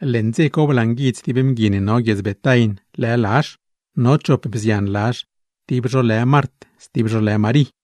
Leṉ dze co blanguidz tib mgui ne no guiedz Betain, lë Lazh; no chop bzian Lazh tib zho lë Mart stib zho lë Marí.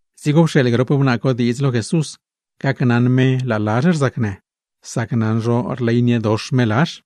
Dzigo pxeeḻ grop wnaa co diidz lo Jesús, gacnaṉ me laa Lazh rzacnë, sac naṉ zho rleyniedox me Lazh.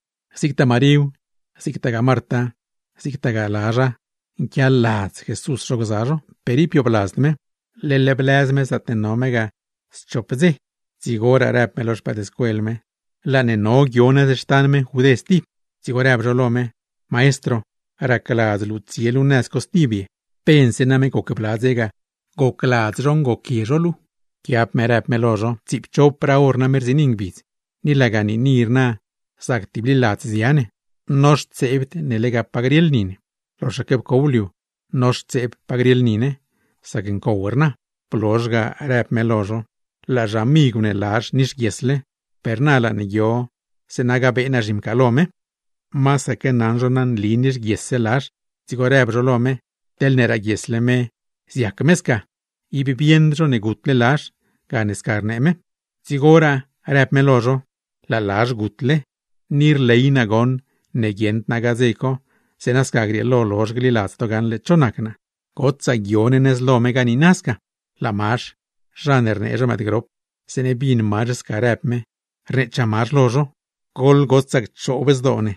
Zigtaa Maríw, zigtaa Marta, zigtagaa Lazha, nquialadz Jesús zho gza zho, per ib biobladzd me; leḻ blëz me schop ngbidz zaatne no me ga. Dzigoraa në me lo no: ―Laa ne guio nëz xtan meṉ Judé stib. Dzigo rdzieets no: ―Maestro, ¿racladz luu tsie luu nëz co stib ye? Pense name goc bla ngbidz ga gocladz zho ngoquie zho luu ga. Nëchaa me: ―Tsiipchopraa hor name rziini ngbidz, ni laga niini rna zac tibliladz zia ne, noxtseebd ne lega pa grieḻ ni ne; loxaque pcow liu, noxtseeb pa grieḻ ni ne; sac ncow rna. Blozh ga në me: ―Laa xamigw ne Lazh nixguiesle, per na laa ne guio zeeṉa gabee naa zhimcaalo me. Tibaque ndioṉ no nli nixguies Lazh, dzigo rdzieets no lo me: ―Teḻne raaguiesle me, zac-wen me sca. Ib bieṉd no ne gutle Lazh, gane sca rnee me. Dzigoraa clar bnee me lo no, në me: ―Laa Lazh gutle. Ni rley naa goṉ ne guieṉd naa ga dze co, zeeṉa sca grieelo lozh gliladz to gaṉle cho nac naa. Goḻgotsaa guio ne nëz lo me ga niina sca. Laa Mazh, zha ne rnee zho “Mëëdgrop”, zeeṉe bin Mazh sca në me, rneechaa Mazh lo no: ―Guieṉd rson, goḻgotsaa cchoob zdoo ne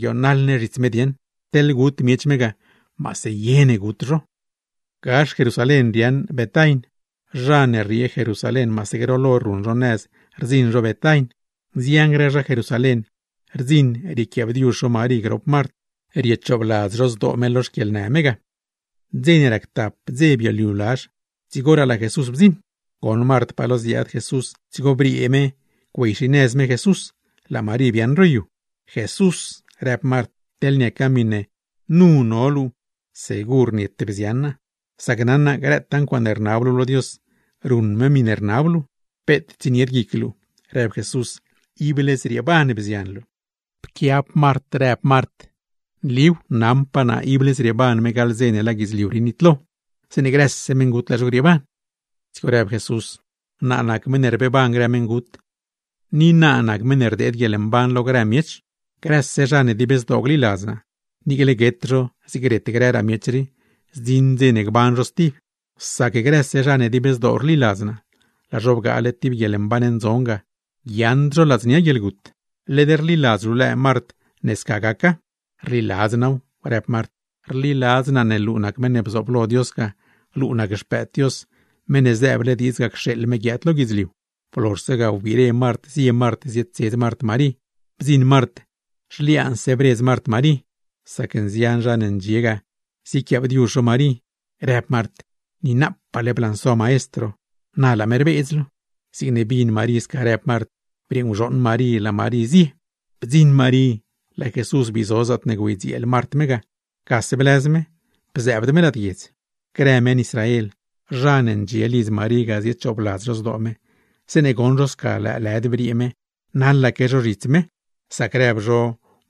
guionaḻ ne zhits me dieṉ. Teḻ gut zho me, maase gut zho ne. Gax Jerusalén riaaṉ Betain. Zha ne rriee Jerusalén, maase groḻ hor ruṉ zho nëz rdziṉ zho Betain. Nzian grë zha Jerusalén rdziṉ riequiaabdiuzh zho Marí grop Mart, riechoobladz zho zdoo me lo xquieḻnë me ga. Dze ne rac tap ngbidz bioliu Lazh, dzigoraa laa Jesús bdziṉ. Goṉ Mart pa lo ziaad Jesús, dzigo briee me biaad-xinëz me Jesús; laa Marí biaaṉ ro yu. ―Jesús ―rëb Mart―, teḻne niaca miṉe nu no luu segur niete bzian naa; sac naṉ naa, grëtaa ncuaaṉe rnab luu lo Dios, ruṉ me miṉe rnab luu. ―Peet tsienied guic luu ―rëb Jesús―, ible zrieeban bzian luu. Pquiab Mart, rëb Mart: ―Nliw, naṉpaa naa ible zrieeban me gaḻ dze ne laa guidzliu rii nitlo, zeeṉe grëse meṉgut, laa zho grieeban. Dzigo rëb Jesús: ―Naa nac meṉ ne rbeeban grë meṉgut, ni naa nac meṉ ne rdeed guieḻmban lo grë miech. Grëse zha ne dib zdoo gliladz naa, niicle guet zho zig ret grëraa miech rii, zdziṉ dze ne gban zho stib. Sac grëse zha ne dib zdoo rliladz naa, laa zho bgaale tib guieḻmban ndzon ga, guiaaṉd zho ladznia guieḻgut. ¿Led rliladz luu lëë Mart, ne sca gaca? ―Rliladz naaw ―rëb Mart―. Rliladz naa ne luu nac meṉ ne bzooblo Dios ga, luu nac Xpëëd Dios, Meṉ ne zëëble diidz ga cxeeḻ me guiaad lo guidzliu. Blozhse ga, wbire Mart zie Mart zietsedz Mart Marí. Bdziṉ Mart zhliaanse bredz Mart Marí (sac nzian zha ne ndxie ga ziequiaabdiuzh Marí) rëb Mart: ―Niinapaale blanso Maestro, na laa me rbeedz luu. Zigne bin Marí sca rëb Mart, briee nguzhooṉ Marí laa Marí zie nëz co. (Bdziṉ Marí, laa Jesús bii zo zaatne güeydzieel Mart me ga; gase blëz me, bzëëbd me lad guiedz.) Grë meṉ Israel, zha ne ndxie lidz Marí ga ziechoobladz zdoo me, zeeṉe goṉ zho sca lëëlëd briee me, naḻaque zho zhits me; sac naṉ zho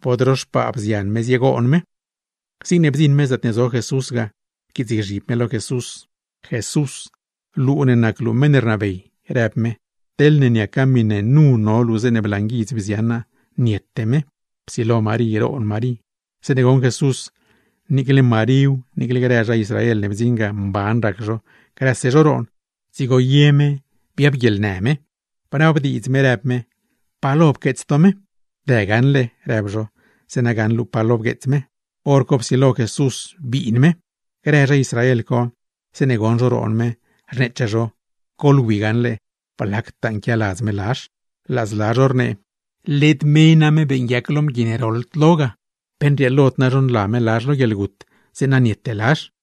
bod ro xpaa bzian me ziegoon me. Zigne bdziṉ me zaatne zo Jesús ga, pquiitsgzhib me lo Jesús. ―Jesús, luu ne nac luu meṉ ne rnabey ―rëb me―, teḻne niaca miṉe nu no luu zeeṉe blanguidz bzian naa, niete me. Psilo Marí roon Marí. Zeeṉe goṉ Jesús, niicle Maríw, niicle grë zha Israel ne bdziṉ ga, mban rac zho, grëse zho roon, dzigo ye me biab guieḻnë me. Bnabdiidz me rëb me: ―¿Pa lo pqueets to me? ―Dë gaṉle ―rëb zho―, zeeṉa gaṉ luu pa lo bgueets me. Horco psilo Jesús biin me. Grë zha Israel co, zeeṉe goṉ zho roon me, rneechaa zho: ―¡Goḻwi gaṉle, blactaa nquialadz me Lazh! Laa zla zho rnee: ―Led me name beeṉguiac lo mgui ne roḻd lo ga, ¿pe nrieelod zha niuṉ me, zeeṉa niete Lazh?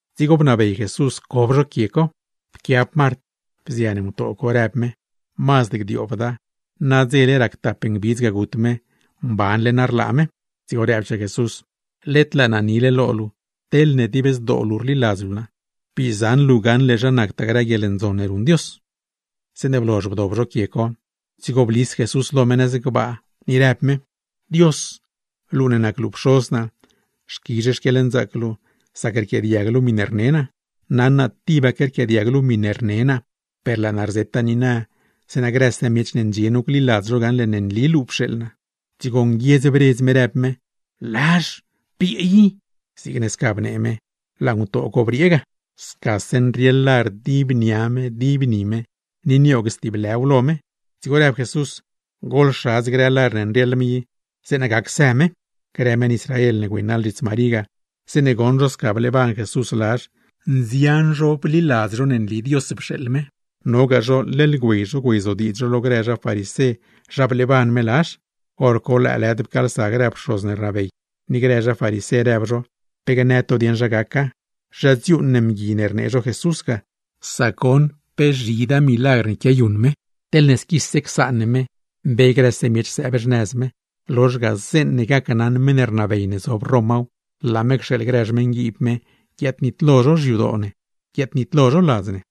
dzigo bnabey Jesús cob zho quie co. Pquiab Mart, bzian ngutoo co rëb me: ―¡Mazd gdioobda! ¡Nadze rac tap ngbidz gut me, mbanle na rlaa me! Dzigo rëbchaa Jesús: ―Led laa naa nile lo luu, teḻne dib zdoo luu rliladz luu naa, bii zaṉ luu gaṉle zha nactaa grë ncuaaṉe ndzon ne ruṉ Dios. Zeeṉe blozh bdob zho quie co, dzigo blis Jesús lo me nëz gbaa, ni rëb me: ―Dios, luu ne nac luu Pxoz naa, xquizh xquieḻnzaac luu sac rquiaadiag luu miṉe rne naa. Naṉ naa tibaque rquiaadiag luu miṉe rnee naa, per laa naa rzeta niina, zeeṉa grëse miech ne ndxie nu gliladz zho gaṉle ne nli luu pxeeḻ naa. Dzigo nguiedz bredz me, rëb me: ―¡Lazh, briee i! Zigne sca bnee me, laa ngutoo co briee ga, scase nrieḻ lar dib nia me, dib ni me ne, ni nioog stib lë lar lo me. Dzigo rëb Jesús: ―¡Goḻxadz grë lar ne nrieḻ me i, zeeṉa guey me! Grë meṉ Israel ne güeynaḻ zhits Marí ga, zeeṉe goṉ zho sca bleeban Jesús Lazh, nzian zho bliladz ne nli Dios pxeeḻ me. Nogaa zho leḻ güey zho güeyzodiidz zho lo grë zha farisé zha bleeban me Lazh. Horco lëëlëd pcaalsa grë pxoz ne rnabey, ni grë zha farisé, rëb zho: ―¿Pe gnë to dieṉ zha gaca? ¿Zha dziuuṉ ne mgui ne rnee zho Jesús ga, sac goṉ pe zhidaa milagr ne quiayuṉ me? Teḻne squise csaan ne me, mbe grëse miech sëëb xnëz me; lozh ga, zeeṉe gacnaṉ meṉ rnabey ne zob Romaw, laa me cxeeḻ grë xmeṉguiib me guiaadnitlo zho xyadoo ne, guiaadnitlo zho ladz ne.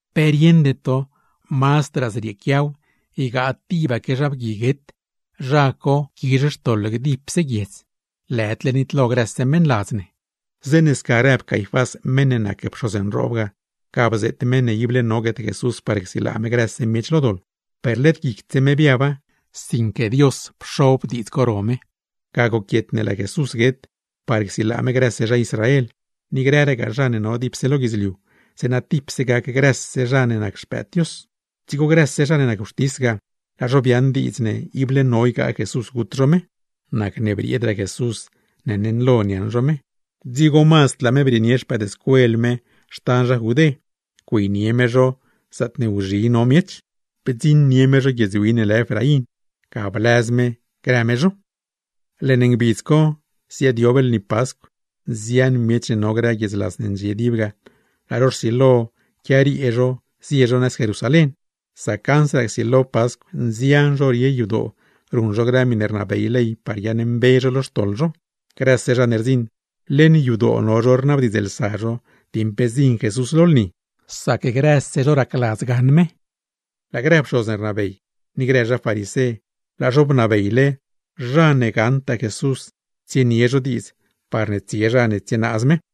¿Pe rieṉde to mazd wena ygaa tib zha guet zho, zha quizh par gdib guiedz, lëdle grëse zha ladz ne nitlo? Zeeṉe sca rëb Caifás meṉ ne nac pxoz nroob ga, ga bzeet me ible no guet Jesús par csilaa me grëse miech lo doḻ; per led guicd me biaba, sinque Dios psiaaba guic me. Ga goquiet ne laa Jesús guet, par csilaa me grëse zha Israel, ni grëragaa zha ne no dipse lo guidzliu, zeeṉa tipse gac grëse zha ne nac xpëëd Dios. Dzigo grëse zha ne nac wxtis ga, laa zho biaaṉ diidz ne ible no ygaa Jesús gut zho me. Nacne brieedraa Jesús ne neṉlo niaṉ zho me; dzigo mazd laa me brieenie no xtan zha Judé, güeynie me no zaatne wzhi no miech, bdziṉ no tib guiedz win lë Efraín, ga bliaaz no grë no me. Leṉ ngbidz co, ziaadyob lni Pascw. Nzian grë miech ne no grë guiedzlas ne ndxie dib ga, laa zho rsilo quiariee zie zho nëz Jerusalén; sac ansraa csilo Pascw nzian zho rie yadoo ruṉ zho grëse miṉe rnabey ley par guiaaṉmbe zho lo xtoḻ zho. Grëse zha ne rdziṉ, leṉ yadoo no zho rnabdiidzlsa zho dieṉ pe zdziṉ Jesús lo lni; sac grëse zho racladz gaṉ me. Laa grë pxoz ne rnabey, ni grë zha farisé, laa zho bnabeyle, zha ne gaṉtaa Jesús, tsienie zho diidz parne tsie zha ne tsienaaz me.